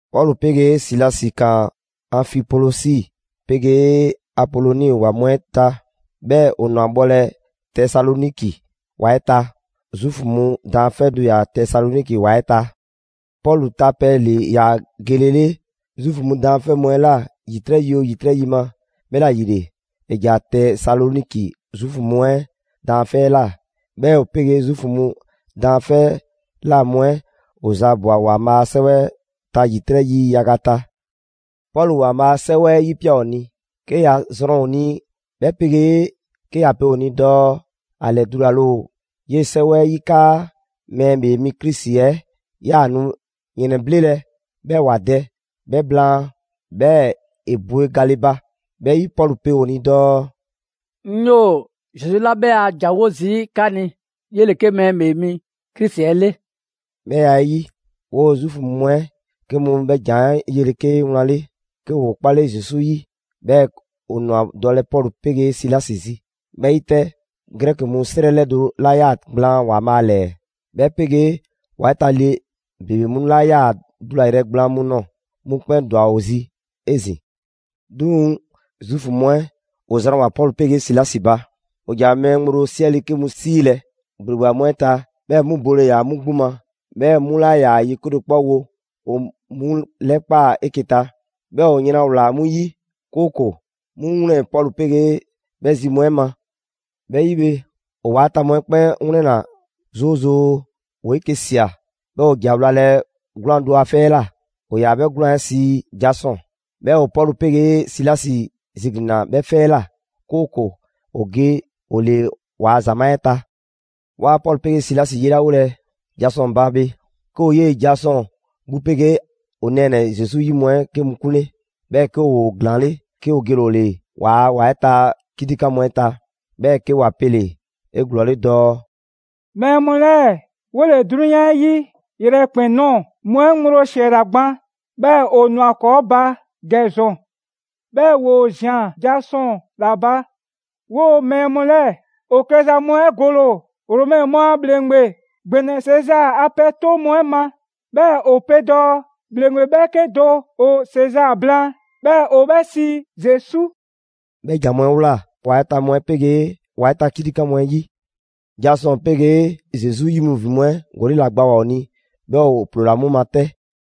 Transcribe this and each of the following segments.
Pɔlu 'pegee Silasi ‑kaan Anfipolisi 'pegee Apoloni ‑wa mu 'ɛ ta, 'bhɛɛ‑ ‑o ‑nwa bhɔlɛ Tesaloniki ‑wa 'ɛ ta. Zuufu mu daanfɛ' do ‑yaa Tesaloniki ‑wa 'ɛ ta. Pɔlu ta pɛ ‑le ‑yaa gelele Zuufu mu daanfɛ' mu 'ɛ ꞊la ‑yitrɛ' yi oo ‑yitrɛ' yi ma, 'bhɛla‑ ‑yile ‑e ‑ja Tesaloniki Zuufu mu 'ɛ daanfɛ' 'ɛ ꞊la. 'Bhɛɛ‑ ‑o 'pegee Zuufu mu daanfɛ' 'ɛ ꞊la mu 'ɛ ‑o zaabwa‑ ‑Waanbhaa' a 'sɛwɛ 'ɛ ta ‑yitrɛ' yi yaga ta. Pɔlu ‑Waanbhaa a 'Sɛwɛ 'ɛ 'yipia꞊ ‑o ni, 'ke ‑ya zrɔn ‑o ni, 'bhɛ 'pegee 'ke ‑ya pe ‑o ni dɔɔ ‑a ‑lɛdulale ‑o 'yee‑ 'sɛwɛ 'ɛ 'yi 'kaa Mɛɛ ‑Bhee mi Krisi 'ɛ ꞊yaa nu ‑yrɛnbhlelɛ, 'bhɛɛ‑ ‑wa dɛ; 'bhɛ blaan, 'bhɛɛ‑ ‑e bwe gale ba. 'Bhɛ 'yi, Pɔlu pe ‑o ni dɔɔ: «'Ŋ 'yoo‑ Zesu 'la 'bhɛ a ‑jan 'wo zii' 'ka ni, 'yele‑ 'ke Mɛɛ ‑Bhee Mi Krisi 'ɛ 'le.» 'Bhɛ ya 'ɛ 'yi, 'woo‑ Zuufu mu 'ɛ 'ke mu 'bhɛ ‑jan 'ɛ 'yele‑ 'ke wlan 'le 'ke ‑woo 'kpale Zesu 'yi, 'bhɛɛ‑ ‑o ꞊nwa dɔlɛ Pɔlu 'pegee Silasi zi. 'Bhɛ 'yi 'tɛ, Grɛki mu 'srɛ 'lɛdo 'la 'yaa‑ gblaan ‑Waanbhaa' ‑lɛɛ, 'bhɛ 'pegee ‑wa 'ɛ ta le ‑bebe mu 'la 'yaa‑ dulayrɛ gblaan mu ꞊nɔɔ, 'mu 'kpɛn ‑dwa ‑o zi 'ezin‑. 'Duŋ‑ Zuufu mu 'ɛ ‑o zranwoa‑ Pɔlu 'pegee Silasi ba. ‑O ‑ja mɛɛ ŋgblo 'siɛle 'ke mu 'siilɛ‑ ‑gbleba mu 'ɛ ta, 'bhɛ mu bole ‑yaa 'mu 'gbu ma, 'bhɛɛ‑ 'mu 'laa ‑yaa ye 'kedo‑ 'kpɔ wo. ‑O 'mu 'lɛkpaa‑ 'eke‑ ta, 'bhɛɛ‑ ‑o yran ꞊wlaa 'mu 'yi, 'kooko‑ 'mu wlɛn Pɔlu 'pegee 'bhɛ zi mu 'ɛ ma. 'Bhɛ 'yi bhe, ‑o ‑wa 'ɛ ta mu 'ɛ 'kpɛn 'wlɛnna‑ 'zoozoo‑. ‑Woo 'eke‑ ꞊sia, 'bhɛɛ‑ ‑o ‑ja wlalɛ 'gwlaan‑ do a 'fɛ 'ɛ ꞊la, ‑o ‑yaa 'bhɛ 'gwlaan‑ 'ɛ sii Jasɔn. 'Bhɛɛ‑ ‑o Pɔlu 'pegee Silasi ziglinna 'bhɛ 'fɛ 'ɛ ꞊la, 'kooko‑ ‑o ge ‑o ‑le waa ‑zamaa' 'ɛ ta. Waa Pɔlu 'pegee Silasi 'yelawolɛ Jasɔn ba bhe, 'ke ‑o 'yee‑ Jasɔn 'gbu 'pegee 'o nɛɛnɛ‑ Zesu 'yi mu 'ɛ 'ke mu 'kunle, 'bhɛɛ‑ 'ke ‑woo ‑glaanle', 'ke ‑o gele‑ ‑o 'le ‑waa' ‑wa 'ɛ ta 'kitikan mu 'ɛ ta. 'Bhɛɛ‑ 'ke ‑wa pele‑ 'eglɔɔle dɔɔ: «Mɛɛ mu 'lɛɛ‑, 'wole‑ 'drunyan 'ɛ 'yi yrɛkpɛn‑ ꞊nɔɔ mu 'ɛ ŋgblo ‑siɛla gban, 'bhɛɛ‑ ‑o ꞊nwa ‑kɔɔ' ba ‑gɛ ‑zɔn. 'Bhɛɛ‑ ‑woo ꞊zian Jasɔn ‑la ba. 'Woo‑ mɛɛ mu 'lɛɛ‑ ‑o klɛza mu 'ɛ gole‑ ‑o Romɛ mu a ‑bhleŋgbe ‑gbɛnɛ Sezaa a pɛ 'toŋ mu 'ɛ ma; 'bhɛɛ‑ ‑o pe dɔɔ ‑bhleŋgbe 'bhɛɛke do ‑o Sezaa blaan, 'bhɛɛ‑ ‑o 'bhɛ sii Zesu.» 'Bhɛ ‑jan mu 'ɛ ꞊wlaa ‑wa 'ɛ ta mu 'ɛ 'pegee ‑wa 'ɛ ta 'kitikan mu 'ɛ 'yi. Jasɔn 'pegee Zesu 'yi mu ‑vin mu 'ɛ gɔli' ‑la gbawoa‑ ‑o ni, 'bhɛɛ‑ ‑o ‑ploola 'mu ma 'tɛ.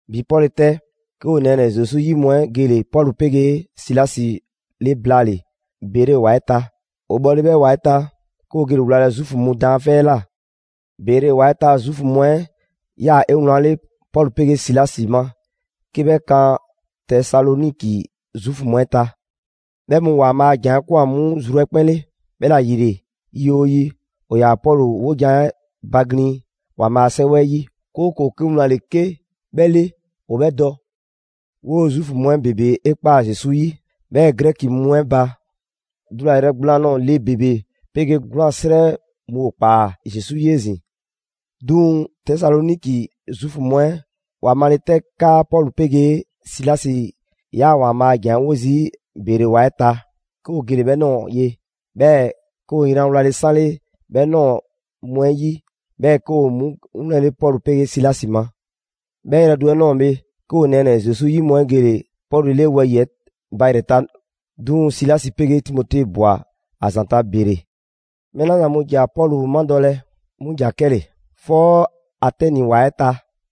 ‑Bi 'pɔle‑ 'tɛ, 'ke 'o nɛɛnɛ‑ Zesu 'yi mu 'ɛ gele‑ Pɔlu 'pegee Silasi 'le blaale‑ Bere ‑wa 'ɛ ta. ‑O bhɔle 'bhɛ ‑wa 'ɛ ta, 'ke ‑o gele‑ wlalɛ Zuufu mu daanfɛ' 'ɛ ꞊la. Bere ‑wa 'ɛ ta Zuufu mu 'ɛ 'yaa‑ 'ewlanle Pɔlu 'pegee Silasi ma 'ke 'bhɛ kan Tesaloniki Zuufu mu 'ɛ ta. 'Bhɛ mu ‑Waanbhaa' a ‑jan 'ɛ 'kwan‑ 'mu zru 'ɛ 'kpɛn 'le. 'Bhɛla‑ ‑yile yi 'oo yi, ‑o ‑yaa Pɔlu 'wojan‑ 'ɛ baglin‑ ‑Waanbhaa' a 'Sɛwɛ 'ɛ 'yi, 'kooko‑ 'ke wlan ‑le 'ke 'bhɛ 'le ‑o 'bhɛ dɔ. 'Woo‑ Zuufu mu 'ɛ ‑bebe 'e ꞊kpaa Zesu 'yi. 'Bhɛɛ‑ Grɛki mu 'ɛ ba, dulayrɛ gblaan ꞊nɔɔ le ‑bebe 'pegee 'gwlaan‑ 'srɛ 'mu ‑o ꞊kpaa Zesu 'yi 'ezin‑. 'Duŋ‑ Tesaloniki Zuufu mu 'ɛ ‑wa male 'tɛ 'kaa Pɔlu 'pegee Silasi ‑yaa ‑Waanbhaa' a ‑jan 'ɛ 'wo zii' Bere ‑wa 'ɛ ta, 'ke ‑o gele‑ 'bhɛ ꞊nɔɔ ye. 'Bhɛɛ‑ 'ke ‑o yran wlale‑ 'sanle 'bhɛ ꞊nɔɔ mu 'ɛ 'yi, 'bhɛɛ‑ 'ke ‑o 'mu 'wlɛnle Pɔlu 'pegee Silasi ma. 'Bhɛ yrɛ do 'ɛ ꞊nɔɔ bhe, 'ke 'o nɛɛnɛ‑ Zesu 'yi mu 'ɛ gele‑ Pɔlu 'le wɛyi‑ 'ɛ ba ‑yrɛ ta; 'duŋ‑ Silasi 'pegee Timote ꞊bwa ‑a ‑zanta' Bere. Mɛɛ 'la zan mu ‑ja Pɔlu madɔlɛ, 'mu ‑ja 'kɛle‑ 'fɔ Atɛni ‑wa 'ɛ ta.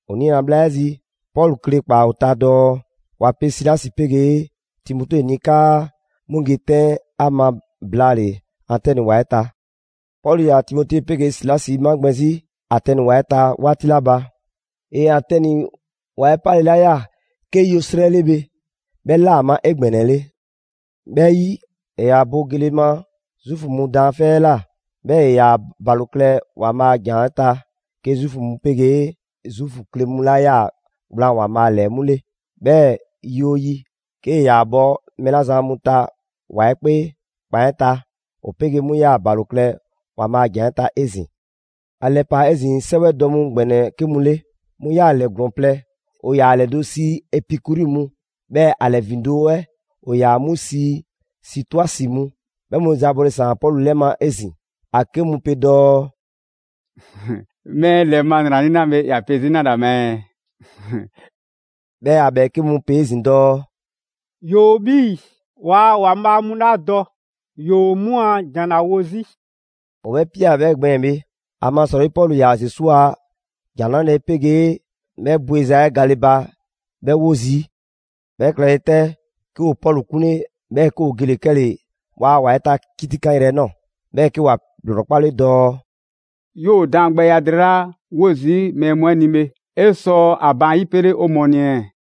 ‑O niina‑ bhla 'ɛ zi, Pɔlu kle ꞊kpaa ‑o ta dɔɔ ‑wa pe Silasi 'pegee Timote ni 'kaa 'mu ge 'tɛn ‑a ma blaale‑ Atɛni ‑wa 'ɛ ta. Pɔlu ‑yaa Timote 'pegee Silasi 'magbɛn‑ 'zi Atɛni ‑wa 'ɛ ta 'waati 'la ba, ‑e Atɛni ‑wa 'ɛ 'pale 'la ꞊ya 'ke yo 'srɛ 'le bhe, 'bhɛ 'laa‑ ‑a ma 'egbɛnɛle. 'Bhɛ 'yi, ‑e ‑yaa bo gele ma Zuufu mu daanfɛ' 'ɛ ꞊la, 'bhɛɛ‑ ‑e ‑yaa ‑balo klɛ ‑Waanbhaa' a ‑jan 'ɛ ta 'ke Zuufu mu 'pegee Zuufu kle mu 'la 'yaa‑ gblaan ‑Waanbhaa' ‑lɛɛ 'mu 'le. 'Bhɛɛ‑ yi 'oo yi, 'kee‑ ‑yaa bhɔ mɛɛ 'la zan mu ta ‑wa 'ɛ 'kpee ‑kpan 'ɛ ta, ‑o 'pegee 'mu 'yaa‑ ‑balo klɛ ‑Waanbhaa' a ‑jan 'ɛ ta 'ezin‑. ‑A ‑lɛpaa 'ezin‑ 'sɛwɛ dɔ mu ‑gbɛnɛ 'ke mu 'le, 'mu ꞊yaa ‑lɛ ‑glɔɔn plɛ: ‑o ‑yaa ‑a ‑lɛdo' sii Epikuri mu, 'bhɛɛ‑ ‑a ‑lɛ ‑vindo' 'ɛ ‑o ‑yaa 'mu sii Sitoisi mu. 'Bhɛ mu zaabɔle ‑saan Pɔlu 'lɛ ma 'ezin‑. ‑A 'ke mu pe dɔɔ: «Mɛɛ ‑lɛ ma ‑nranii' 'la bhe, ‑ya pe 'zi 'nale‑ ‑a ma ɛɛ?» 'Bhɛɛ‑ ‑a ‑bhɛɛke' mu pe 'ezin‑ dɔɔ: «‑Yoo 'bhii‑ waa ‑waanbhaa' mu 'la dɔ, ‑yoo 'mu a ‑jan ‑la wo 'zi.» ‑O 'bhɛ ꞊pia 'bhɛ gbɛɛn‑ bhe, ‑amasrɔyi Pɔlu ‑yaa Zesu a ‑Jan 'Nrale‑ 'pegee 'bhɛ bweza 'ɛ gale ba 'bhɛɛ‑ 'wo zii'. 'Bhɛ klɛle 'tɛ, 'ke ‑o Pɔlu 'kunle 'bhɛɛ‑ 'ke ‑o gele‑ 'kɛle‑ ‑waa' ‑wa 'ɛ ta 'kitikanyrɛ yrɛ 'ɛ ꞊nɔɔ, 'bhɛɛ‑ 'ke ‑wa ‑lrɔkpale dɔɔ: «'Yoo‑ daangbɛya drɛɛ 'la 'wo zii' mɛɛ mu 'ɛ ni bhe, 'e sɔ ‑a baan' 'yipele 'o mɔɔ ni ɛɛ?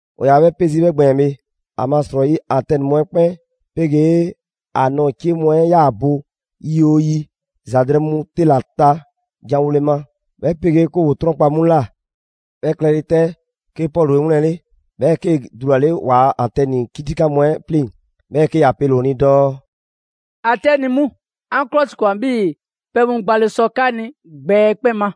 ‑O 'yaa‑ 'bhɛ 'pe zii' 'bhɛ gbɛɛn‑ bhe, ‑amasrɔyi Atɛni mu 'ɛ 'kpɛn 'pegee ‑a nɔɔ‑ 'cie mu 'ɛ 'yaa‑ bo yi 'oo yi ‑za drɛɛ mu 'te ‑la ta janwole ma, 'bhɛ 'pegee 'ke ‑woo 'trɔnkpa‑ 'mu ꞊la. 'Bhɛ klɛle 'tɛ, 'ke Pɔlu 'e 'wlɛnle‑, 'bhɛɛ‑ 'kee‑ dulale ‑waa' Atɛni 'kitikan mu 'ɛ 'pleŋ‑, 'bhɛɛ‑ 'ke ‑ya pele‑ ‑o ni dɔɔ: «Atɛni mu, 'an 'klɔsikwan 'bhii‑ pɛ mu gbale sɔ 'ka ni gbɛ 'ɛ 'kpɛn ma.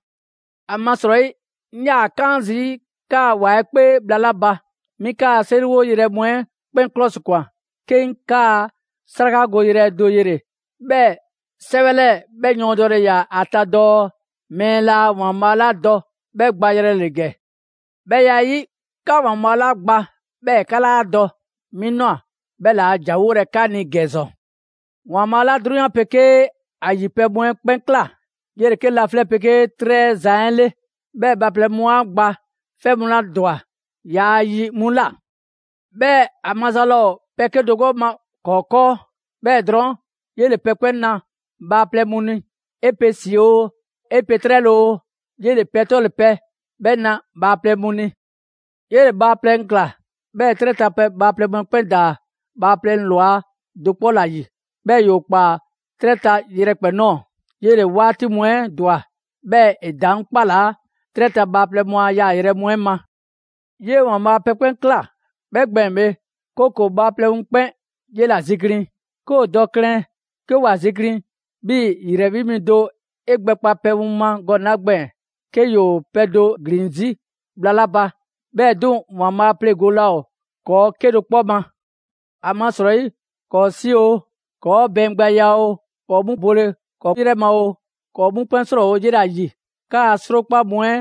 ‑Amasrɔyi 'ŋ 'yaa‑ 'kaan zii' 'kaa‑ ‑wa 'ɛ 'kpee bhla 'la ba, 'mi 'kaa‑ 'seriwo yrɛ mu 'ɛ 'kpɛn 'klɔsikwan, 'ke 'ŋ 'kaa‑ 'srakagoyrɛ do yele‑, 'bhɛɛ‑ 'sɛwɛ 'lɛɛ‑ 'bhɛ yɔɔndɛle ‑o ‑a ta dɔɔ: ‹Mɛɛ laa ‑waanbhaa' 'la dɔ 'bhɛ gbayrɛ ‑le ‑gɛ.› 'Bhɛ ya 'ɛ 'yi, 'ka ‑Waanbhaa' 'la gba 'bhɛɛ‑ 'ka 'laa dɔ, 'mi ꞊nwa 'bhɛ ‑le a ‑janwolɛ 'ka ni ‑gɛ ‑zɔn. ‑Waanbhaa' 'la 'drunyan 'pegee ‑a ‑yi pɛ mu 'ɛ 'kpɛn ꞊kla, 'yele‑ 'ke laflɛ' 'pegee 'trɛ 'ɛ Zan 'le, 'bhɛɛ‑ bhaaplɛŋ mu 'a gba 'fɛ mu 'la ‑dwa yaa yi 'mu ꞊la. 'Bhɛɛ‑ ‑a maza laa ‑o pɛ 'kedo‑ ma ‑kɔɔ' 'kɔɔ. 'Bhɛɛ‑ drɔɔn', 'yele‑ pɛ 'kpɛn na bhaaplɛŋ mu ni: 'e pe ‑si oo, 'e pe 'trɛle‑ oo, 'yele‑ pɛ 'tɔle‑ pɛ 'bhɛ na bhaaplɛŋ mu ni. 'Yele‑ bhaaplɛŋ ꞊kla, 'bhɛɛ‑ 'trɛ ta bhaaplɛŋ mu 'ɛ 'kpɛn ‑daa bhaaplɛŋ ‑lwa do 'kpɔ ‑la ‑yi. 'Bhɛɛ‑ ‑yoo ꞊kpaa 'trɛ ta yrɛkpɛn‑ ꞊nɔɔ. 'Yele‑ 'waati mu 'ɛ ‑dwa, 'bhɛɛ‑ ‑e ‑daŋ' 'kpalaa 'trɛ ta bhaaplɛŋ mu yaayrɛ mu 'ɛ ma. 'Yee‑ ‑Waanbhaa' pɛ 'kpɛn ꞊kla 'bhɛ gbɛɛn‑ bhe, 'kooko‑ bhaaplɛŋ mu 'kpɛn 'yela‑ ziglin. 'Ke ‑o dɔ klɛn 'ke ‑wa ziglin, 'bhii‑ ‑yrɛ 'wi mi do 'e gbɛkpa pɛ mu ma gɔnɛ‑ 'la gbɛɛn‑ 'ke ‑yoo pɛ do ‑glin 'zi bhla 'la ba; 'bhɛɛ‑ 'duŋ‑ ‑Waanbhaa' pleŋgole laa ‑o ‑kɔɔ' 'kedo‑ 'kpɔ ma. ‹‑Amasrɔyi ‑kɔɔ' ‑si oo, ‑kɔɔ' bɛɛngbɛya oo, ‑kɔɔ' 'gbu bole ‑kɔɔ' 'yrɛ ma oo, ‑kɔɔ' 'mu 'kpɛn 'srɔɔwo‑ 'yela‑ ‑yi.› 'Kaa‑ 'srokpa mu 'ɛ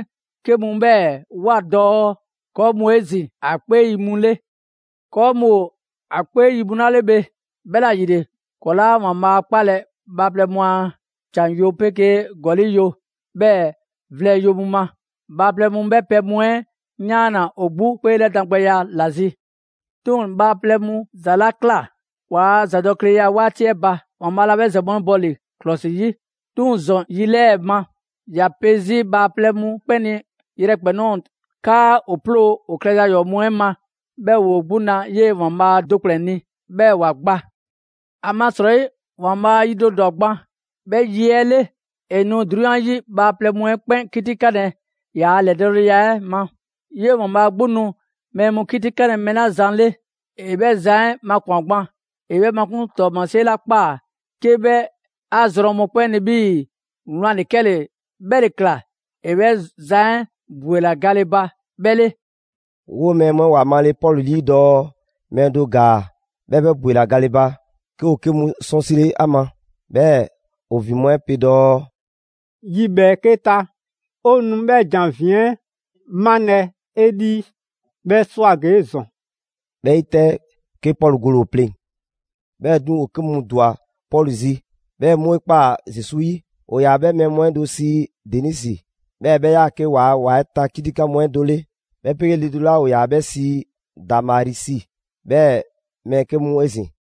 'ke mu 'bhɛɛ‑ ꞊woa dɔɔ: ‹‑Kɔɔ' mu ‑o 'ezin‑ ‑a 'kpee yi mu 'le.› «‑Kɔɔ' mu ‑o ‑a 'kpee yi mu 'la 'le bhe, 'bhɛla‑ ‑yile ‑kɔɔ' 'laa ‑Waanbhaa' 'kpalɛ‑ bhaaplɛŋ mu a ‑can yo 'pegee ‑gɔli' yo, 'bhɛɛ‑ vlɛ yo mu ma. Bhaaplɛŋ mu 'bhɛ pɛ mu 'ɛ 'yaanna‑ ‑o 'gbu 'kpeelɛdan gbɛya ‑la zi. 'Duŋ‑ bhaaplɛŋ mu ‑za 'la ꞊kla waa ‑zadɔkleya 'waati 'ɛ ba, ‑Waanbhaa' laa 'bhɛ ‑za mu 'ɛ bɔ ‑li ‑klɔsi 'yi; 'duŋ‑ ‑zɔn yi 'lɛɛ‑ ma, ‑ya pe 'zi bhaaplɛŋ mu 'kpɛn ni yrɛkpɛn‑ ꞊nɔɔ 'kaa ‑o 'ploo‑ ‑o klɛza ‑yɔɔ' mu 'ɛ ma 'bhɛɛ‑ ‑woo 'gbu 'na 'yee ‑Waanbhaa' do ‑kplɛn ni, 'bhɛɛ‑ ‑wa gba. ‑Amasrɔyi ‑Waanbhaa' yi do ‑dwa gban, 'bhɛ yi 'ɛ 'le, ‑e nu 'drunyan 'yi bhaaplɛŋ mu 'ɛ 'kpɛn 'kitikanlɛ ‑yaa' ‑lɛdɔɔleya 'ɛ ma. 'Yee‑ ‑Waanbhaa 'gbu nu mɛɛ mu 'kitikanlɛ mɛɛ 'la zan 'le, ‑e 'bhɛ zan 'ɛ makwan‑ gban. ‑E 'bhɛ makun' ‑tɔɔmasie 'la ꞊kpaa 'ke 'bhɛ 'a zrɔn mɔkpɛn' ni 'bhii‑ wlan ‑le 'kɛle‑ 'bhɛ ‑le ꞊kla ‑e 'bhɛ zan 'ɛ bwelawoa gale ba 'bhɛ 'le.» 'Woo mɛɛ mu 'ɛ ‑wa male Pɔlu 'lii dɔɔ mɛɛ do ‑gaa 'bhɛɛ‑ 'bhɛ ‑bwela gale ba, 'ke ‑o 'ke mu 'sɔnsile 'a ma, 'bhɛɛ‑ ‑o ‑vin mu 'ɛ pe dɔɔ: «Yi ‑bhɛɛke' ta, 'o nu 'bhɛ ‑jan 'ɛ ‑vin 'ɛ 'malɛ‑ 'e 'lii, 'bhɛ 'swa‑ ‑gee' ‑zɔn.» 'Bhɛ 'yi 'tɛ, 'ke Pɔlu gole‑ ‑o pleŋ‑. 'Bhɛɛ‑ 'duŋ‑, ‑o 'ke mu ‑dwa Pɔlu zi, 'bhɛɛ‑ 'mu 'e ꞊kpaa Zesu 'yi: ‑o ‑yaa 'bhɛ mɛɛ mu 'ɛ do sii Denisi, 'bhɛɛ‑ 'bhɛ 'yaa‑ 'ke ‑waa' ‑wa 'ɛ ta 'kitikan mu 'ɛ do 'le; 'bhɛ 'pegee le do 'la ‑o ‑yaa 'bhɛ sii Damarisi, 'bhɛɛ‑ mɛɛ 'ke mu 'ezin‑.